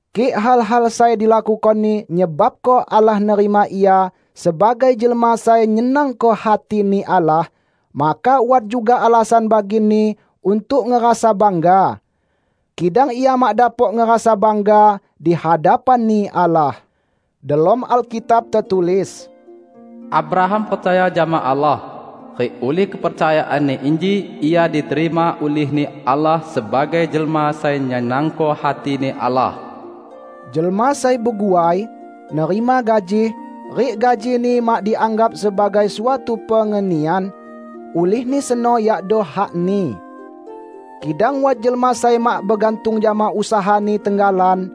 Kik hal-hal sai dilakukoni nyebabko Allah nerima ia sebagai jelma sai nyenangko hati-Ni Allah, maka wat juga alasan bagini untuk ngerasa bangga. Kidang ia mak dapok ngerasa bangga di hadapan-Ni Allah. Delom Alkitab tetulis, "Abraham percaya jama Allah, rik ulih kepercayaanni inji ia diterima ulih-Ni Allah sebagai jelma sai nyenangko hati-Ni Allah." Jelma sai beguai, nerima gaji; rik gajini mak dianggap sebagai suatu pengenian, ulihni seno yakdo hakni. Kidang wat jelma sai mak begantung jama usahani tenggalan;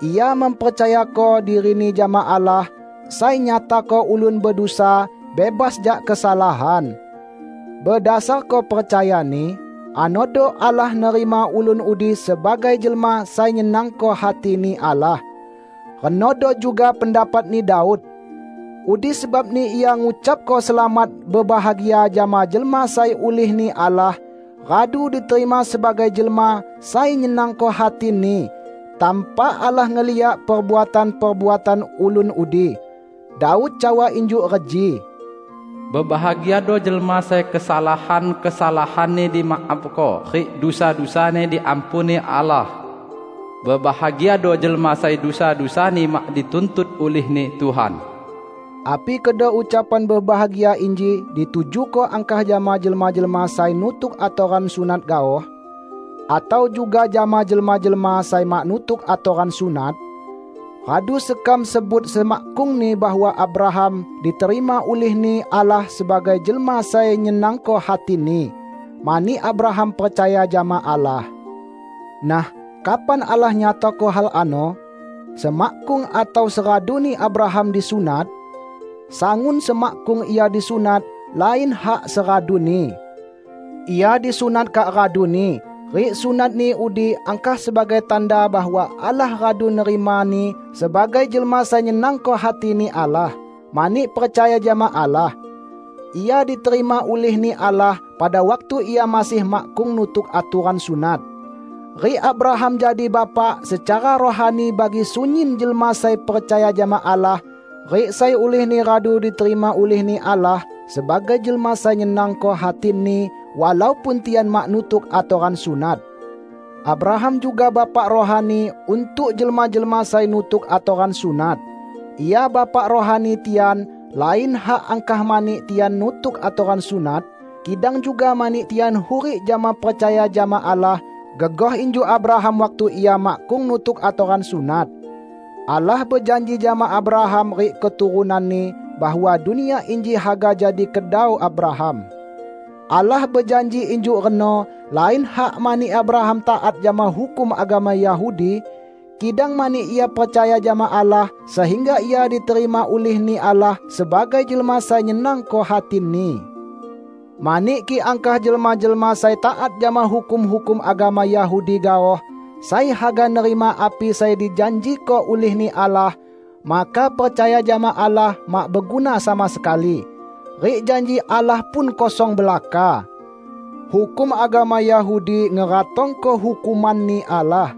ia mempercayako dirini jama Allah sai nyatako ulun bedusa bebas jak kesalahan. Bedasarko percayani anodo Allah nerima ulun udi sebagai jelma sai nyenangko hati-Ni Allah. Renodo juga pendapatni Daud; udi sebabni ia ngucapko selamat bebahagia jama jelma sai ulih-Ni Allah radu diterima sebagai jelma sai nyenangko hati-Ni, tanpa Allah ngeliak perbuatan-perbuatan ulun udi. Daud cawa injuk reji, "Bebahagiado jelma sai kesalahan-kesalahanni dimaafko rik dusa-dusani diampuni Allah! Bebahagiado jelma sai dusa-dusani mak dituntut ulih-Ni Tuhan!" Api kedo ucapan bebahagia inji ditujuko angkah jama jelma-jelma sai nutuk atoran sunat gaoh? Atau juga jama jelma-jelma sai mak nutuk atoran sunat? Radu sekam sebut semakkungni, bahwa Abraham diterima ulih-Ni Allah sebagai jelma sai nyenangko hati-Ni, mani Abraham percaya jama Allah. Nah, kapan Allah nyatako hal ano? Semakkung atau seraduni Abraham disunat? Sangun semakkung ia disunat, lain hak seraduni. Ia disunat kak raduni, rik sunatni udi angkah sebagai tanda bahwa Allah radu nerimani sebagai jelma sai nyenangko hati-Ni Allah, mani percaya jama Allah. Ia diterima ulih-Ni Allah pada waktu ia masih makkung nutuk atoran sunat. Rik Abraham jadi bapak secara rohani bagi sunyin jelma sai percaya jama Allah, rik sai ulihni radu diterima ulih-Ni Allah sebagai jelma sai nyenangko hati-Ni, walaupun tian mak nutuk atoran sunat. Abraham juga bapak rohani untuk jelma-jelma sai nutuk atoran sunat. Ia bapak rohani tian lain hak angkah mani tian nutuk atoran sunat, kidang juga mani tian hurik jama percaya jama Allah, gegoh injuk Abraham waktu ia makkung nutuk atoran sunat. Allah bejanji jama Abraham rik keturunanni bahwa dunia inji haga jadi kedau Abraham. Allah bejanji injuk reno lain hak mani Abraham taat jama hukum agama Yahudi, kidang mani ia percaya jama Allah sehingga ia diterima ulih-Ni Allah sebagai jelma sai nyenangko hati-Ni. Mani kik angkah jelma-jelma sai taat jama hukum-hukum agama Yahudi gaoh sai haga nerima api sai dijanjiko ulih-Ni Allah, maka percaya jama Allah mak beguna sama sekali, rik janji Allah pun kosong belaka. Hukum agama Yahudi ngeratongko hukuman-Ni Allah.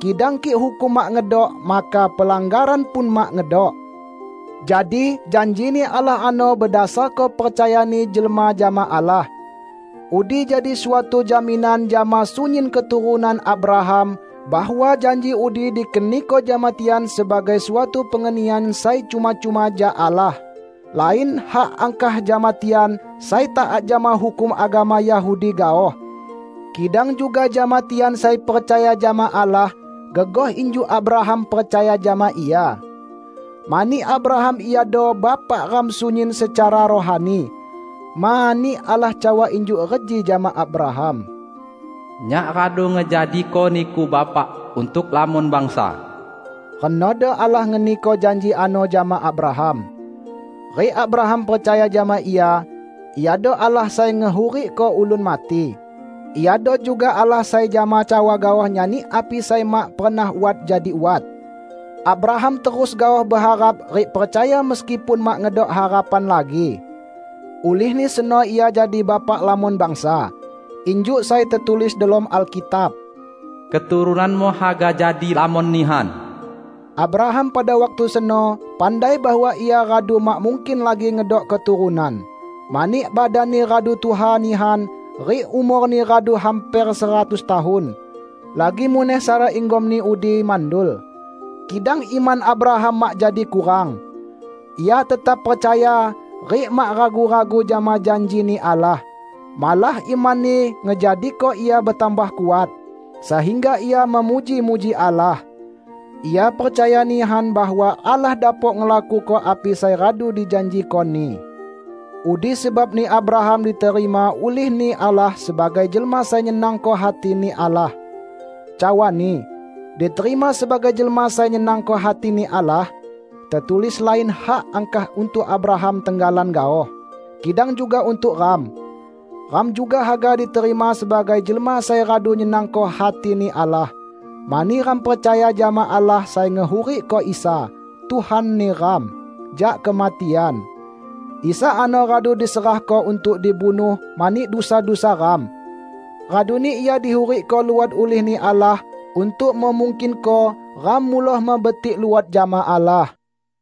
Kidang kik hukum mak ngedok, maka pelanggaran pun mak ngedok. Jadi janji-Ni Allah ano bedasarko percayani jelma jama Allah. Udi jadi suatu jaminan jama sunyin keturunan Abraham bahwa janji udi dikeniko jama tian sebagai suatu pengenian sai cuma-cuma jak Allah; lain hak angkah jama tian sai taat jama hukum agama Yahudi gaoh, kidang juga jama tian sai percaya jama Allah gegoh injuk Abraham percaya jama Ia. Mani Abraham iado bapak ram sunyin secara rohani. Mani Allah cawa injuk reji jama Abraham, "Nyak radu ngejadiko niku bapak untuk lamon bangsa." Renodo Allah ngeniko janji ano jama Abraham. Rik Abraham percaya jama Ia. Iado Allah sai ngehurikko ulun mati; Iado juga Allah sai jama cawa gaoh nyani api sai mak pernah wat jadi wat. Abraham terus gaoh beharap rik percaya meskipun mak ngedok harapan lagi. Ulihni seno ia jadi bapak lamon bangsa. Injuk sai tetulis delom Alkitab, "Keturunanmu haga jadi lamon nihan." Abraham pada waktu seno pandai bahwa ia radu mak mungkin lagi ngedok keturunan, mani badanni radu tuha nihan rik umorni radu hamper seratus tahun; lagi muneh Sara, inggomni udi, mandul. Kidang iman Abraham mak jadi kurang. Ia tetap percaya rik mak ragu-ragu jama janji-Ni Allah. Malah imanni ngejadiko ia betambah kuat, sehingga ia memuji-muji Allah. Ia percaya nihan bahwa Allah dapok ngelakuko api sai radu dijanjiko-Ni. Udi sebabni Abraham diterima ulih-Ni Allah sebagai jelma sai nyenangko hati-Ni Allah. Cawani "diterima sebagai jelma sai nyenangko hati-Ni Allah" tetulis lain hak angkah untuk Abraham tenggalan gaoh, kidang juga untuk ram. Ram juga haga diterima sebagai jelma sai radu nyenangko hati-Ni Allah, mani ram percaya jama Allah sai ngehurikko Isa, Tuhan neram, jak kematian. Isa ano radu diserahko untuk dibunuh mani dusa-dusa ram; raduni Ia dihurikko luot ulih-Ni Allah untuk memungkinko ram muloh mebetik luot jama Allah.